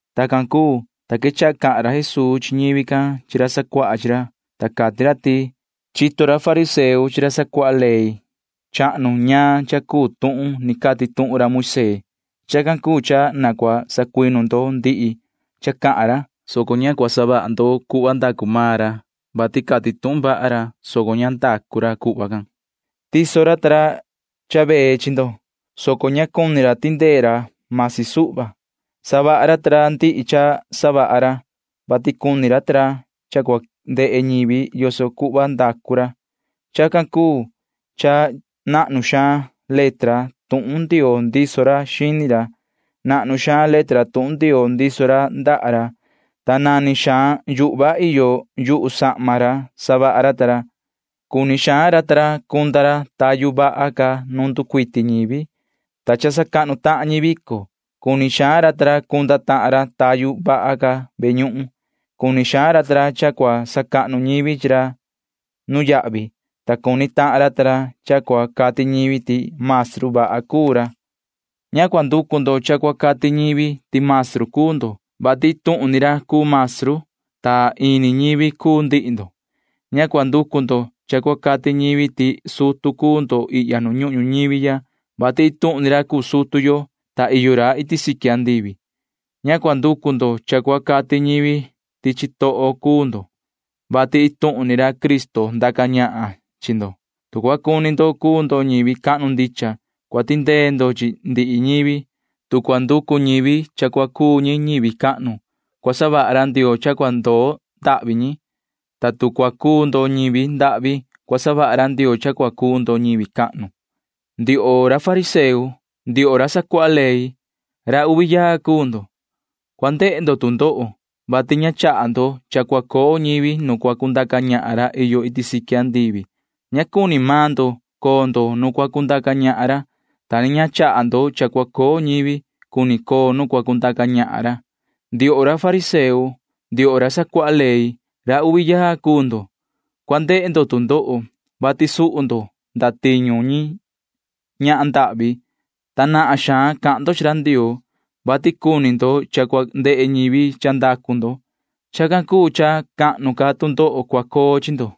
Tacan cuu, ta quechaha cahan ra Jesuu chi ñivi can chi ra sacuaha chi ra, ta cati ra ti: ―Chito maan ra fariseo chi ra sacuaha ley chahnu ñaan cha cuu tuhun ni cati tuhun ra Moisee. Chacan cuu cha na cua sacuinu ndo ndihi cha cahan ra, soco ña cua savaha ndo cuhva ndacu maan ra, vati cati tuhun vaha ra, soco ña ndacu ra cuhva can. Tiso ra ta ra cha vee chi ndo, soco ña cuni ra ta ra tindee ra―masi suhva. Savaha ra ta ra ndihi cha savaha ra, vati cuni ra ta ra cha cua ndehe ñivi yoso cuhva ndacu ra. Chacan cuu cha nahnu xaan letra tuhun Ndioo ndiso ra xini ra, nahnu xaan letra tuhun Ndioo ndiso ra ndaha ra, ta nani xaan yuhva iyo yu sahma ra savaha ra ta ra. Cuni xaan ra ta ra cunda ra tayu vaha ca nu nducuiti ñivi, ta cha sacahnu tahan ñi vico. Cuni xaan ra ta ra cunda tahan ra tayu vaha ca ve ñuhun. Cuni xaan ra ta ra cha cua sacahnu ñivi chi ra nuyahvi, ta cuni tahan ra ta ra cha cua cati ñivi ti maestru vaha cuu ra. ’Ña cua nducu ndo cha cua cati ñivi ti maestru cuu ndo, vati iin tuhun ni ra cuu maestru, ta ini ñivi cuu ndihi ndo. Ña cua nducu ndo cha cua cati ñivi ti sutu cuu ndo ihya nu ñuhun ñuñivi ya, vati iin tuhun ni ra cuu sutu yo, ta iyo ra iti siqui andivi. Ña cua nducu ndo cha cua cati ñivi ti chitoho cuu ndo, vati iin tuhun ni ra Cristo ndaca ñahan chi ndo. Tu cua cuni ndo cuu ndo ñivi cahnu ndicha, cua tindee ndo chi ndihi ñivi. Tu cua nducu ñivi cha cua cuu ñi ñivi cahnu, cua savaha ra Ndioo cha cua ndoo ndahvi ñi, ta tu cua cuu ndo ñivi ndahvi, cua savaha ra Ndioo cha cua cuu ndo ñivi cahnu. ’Ndioho ra fariseo, ndioho ra sacuaha ley, ra uvi yaa cuu ndo. Tu ndoho cua ndehe ndo, vati ña chaha ndo cha cua coo ñivi nu cua cundaca ñahan ra iyo iti siqui andivi. Ña cuni maan ndo coo ndo nu cua cundaca ñahan ra, ta ni ña chaha ndo cha cua coo ñivi cuni coo nu cua cundaca ñahan ra. ’Ndioho ra fariseo, ndioho ra sacuaha ley, ra uvi yaa cuu ndo. Tu ndoho cua ndehe ndo, vati suhu ndo ndatiñu ñi ñahan ndahvi, ta nahan xaan cahan ndo chi ra Ndioo, vati cuni ndo cha cua ndehe ñivi cha ndacu ndo. Chacan cuu cha cahnu ca tu ndoho cua coo chi ndo.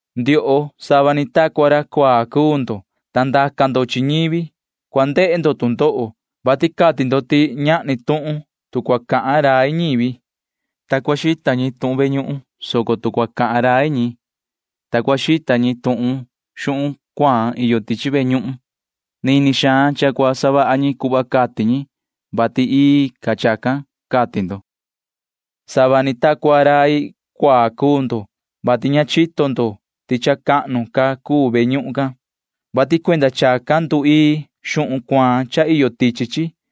’Ndioho, sava ni ta cua ra cuaa cuu ndo, ta ndaca ndo chi ñivi. Tu ndoho cua ndehe ndo, vati cati ndo ti ñahni tuhun tu cua cahan rai ñivi, ta cua xita ñi tuhun ve ñuhun, soco tu cua cahan rai ñi, ta cua xita ñi tuhun xuhun cuaan iyo tichi ve ñuhun, nini xaan cha cua savaha ñi cuhva cati ñi, [vati ii ca chacan,] cati ndo. Sava ni ta cua rai cuaa cuu ndo, vati ña chito ndo ti cha cahnu ca cuu ve ñuhun can, vati cuenda chacan nduii xuhun cuaan cha iyo tichi chi.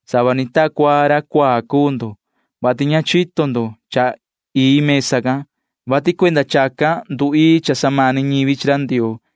Sava ni ta cua ra cuaa cuu ndo, vati ña chito ndo ti cha cahnu ca cuu mesa can, vati cuenda chacan nduii cha samani ñivi chi ra Ndioo.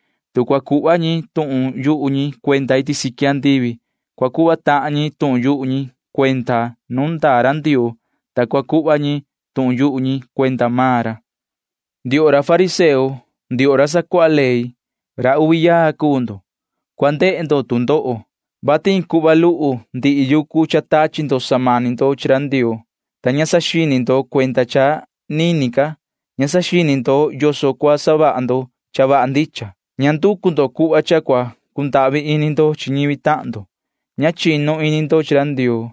Tu cua xita ñivi tuhun iti siqui andivi, cua xita ñi tuhun nu iyo ra Ndioo, ta cua xita ñi suvi ni tuhun maan ra. ’Ndioho ra fariseo, ndioho ra sacuaha ley, ra uvi yaa cuu ndo. Tu ndoho cua ndehe ndo, vati iin cuhva luhu ndihi yucu cha tachi ndo samani ndo chi ra Ndioo, ta ña saxini ndo cuenda cha nini ca. Ña saxini ndo yoso cua savaha ndo cha vaha ndicha. Ña nducu ndo cuhva cha cua cundahvi ini ndo chi ñivi tahan ndo. Ña chinu ini ndo chi ra Ndioo.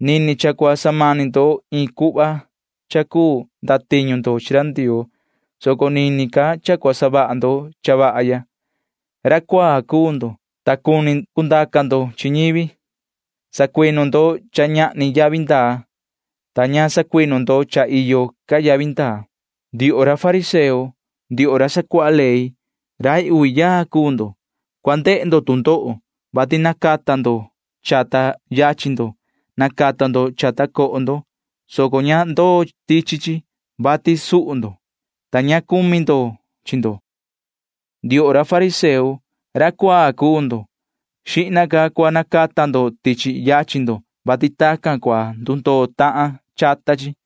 Nini cha cua samani ndo iin cuhva cha cuu ndatiñu ndo chi ra Ndioo, soco nini ca cha cua savaha ndo cha vaha ya. Ra cuaa cuu ndo, ta cuni cundaca ndo chi ñivi. Sacuinu ndo cha ñahni yavi ndaa, ta ña sacuinu ndo cha iyo ca yavi ndaa. ’Ndioho ra fariseo, ndioho ra sacuaha ley, rai uvi yaa cuu ndo. Tu ndoho cua ndehe ndo, vati nacata ndo chata yachin ndo. Nacata ndo chata coho ndo, soco ña ndoo tichi chi, vati suhu ndo, ta ña cumi ndo chi ndo. Ndioho ra fariseo, ra cuaa cuu ndo. Xihna ca cua nacata ndo tichi yachin ndo, vati tacan cua ndundoo tahan chata chi.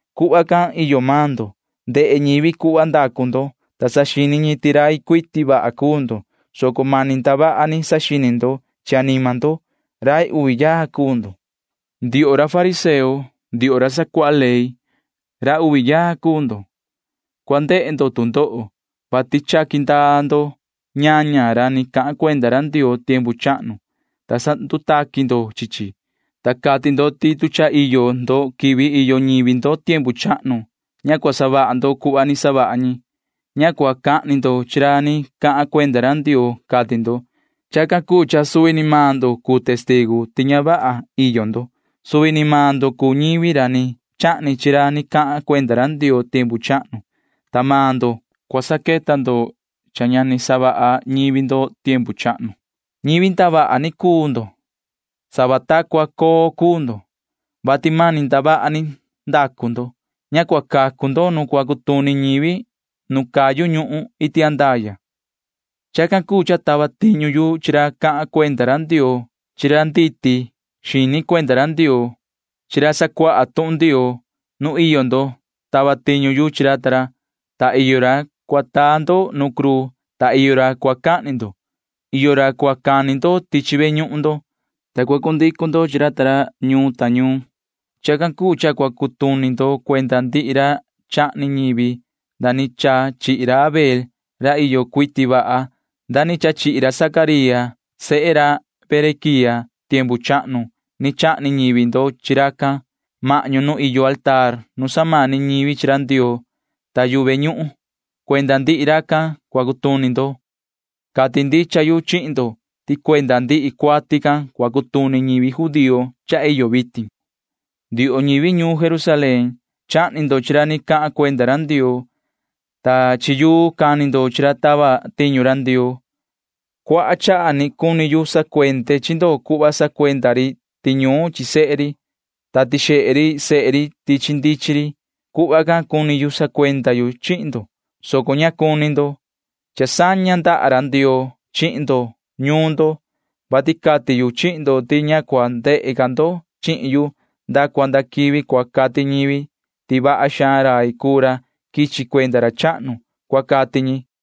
Cuhva can iyo maan ndo. Ndehe ñivi cuhva ndacu ndo, ta saxini ñi ti rai cuiti vaha cuu ndo, soco mani ndavaha ni saxini ndo chi anima ndo. Rai uvi yaa cuu ndo. ’Ndioho ra fariseo, ndioho ra sacuaha ley, ra uvi yaa cuu ndo. Tu ndoho cua ndehe ndo, vati chaqui ndaa ndo ñaña ra ni cahan cuenda ra Ndioo tiempu chahnu, ta sandutaqui ndo chi chi, ta cati ndo ti tu cha iyo ndo quivi iyo ñivi ndo tiempu chahnu, ña cua savaha ndo cuhva ni savaha ñi. Ña cua cahni ndo chi ra ni cahan cuenda ra Ndioo, cati ndo. Chacan cuu cha suvi ni maan ndo cuu testigu ti ña vaha iyo ndo. Suvi ni maan ndo cuu ñivi ra ni chahni chi ra ni cahan cuenda ra Ndioo tiempu chahnu, ta maan ndo―cua saqueta ndo cha ña ni savaha ñivi ndo tiempu chahnu. ’Ñivi ndavaha ni cuu ndo. Sava ta cua ri coo cuu ndo, [vati mani ndavaha ni ndacu ndo]. Ña cua cacu ndo nu cua cutuni ñivi nu cayu ñuhun iti andaya. Chacan cuu cha tava tiñu yu chi ra cahan cuenda ra Ndioo chi ra nditi xini cuenda ra Ndioo chi ra sacuaha tuhun Ndioo. Nu iyo ndo tava tiñu yu chi ra ta ra, ta iyo ra cua taa ndo nu cruu, ta iyo ra cua cahni ndo. Iyo ra cua cani ndo tichi ve ñuhun ndo, ta cua cundicu ndo chi ra ta ñuun ta ñuun. Chacan cuu cha cua cutuni maan ndo cuenda ndihi ra chahni ñivi nda ni cha chihi ra Abel ra iyo cuiti vaha nda ni cha chihi ra Zacaría sehe ra Berequía. Tiempu chahnu cha ni chahni ñivi ndo chi racan mahñu nu iyo mesa nu samani ñivi chi ra Ndioo ta yu ve ñuhun. Cuenda ndihi racan cua cutuni ndo. Cati ndicha yu chihin ndo ti cuenda ndihi cuati can cua cutuni ñivi judío cha iyo vitin. [Ni vii cahan ra Jesuu:] ’Ndioho ñivi ñuun Jerusalén, chahni ndo chi ra ni cahan cuenda ra Ndioo, ta chi yuu cani ndo chi ra tava tiñu ra Ndioo. Cuaha chaha ni cuni yu sacuende chi ndo cuhva sacuenda ri tiñuun chi sehe ri, ta tixehe ri sehe ri tichi ndichin ri. Cuni yu sacuenda yu chihin ndo, soco ña cuni maan ndo. Cha saña ndaha ra Ndioo chihin ndo ñuun ndo, vati cati yu chihin ndo ti ña cua ndehe ca ndo chihin yu nda cua nda quivi cua cati ñivi ti vaha xaan rai cuu ra quichi cuenda ra chahnu, cua cati ñi ―cati ra Jesuu.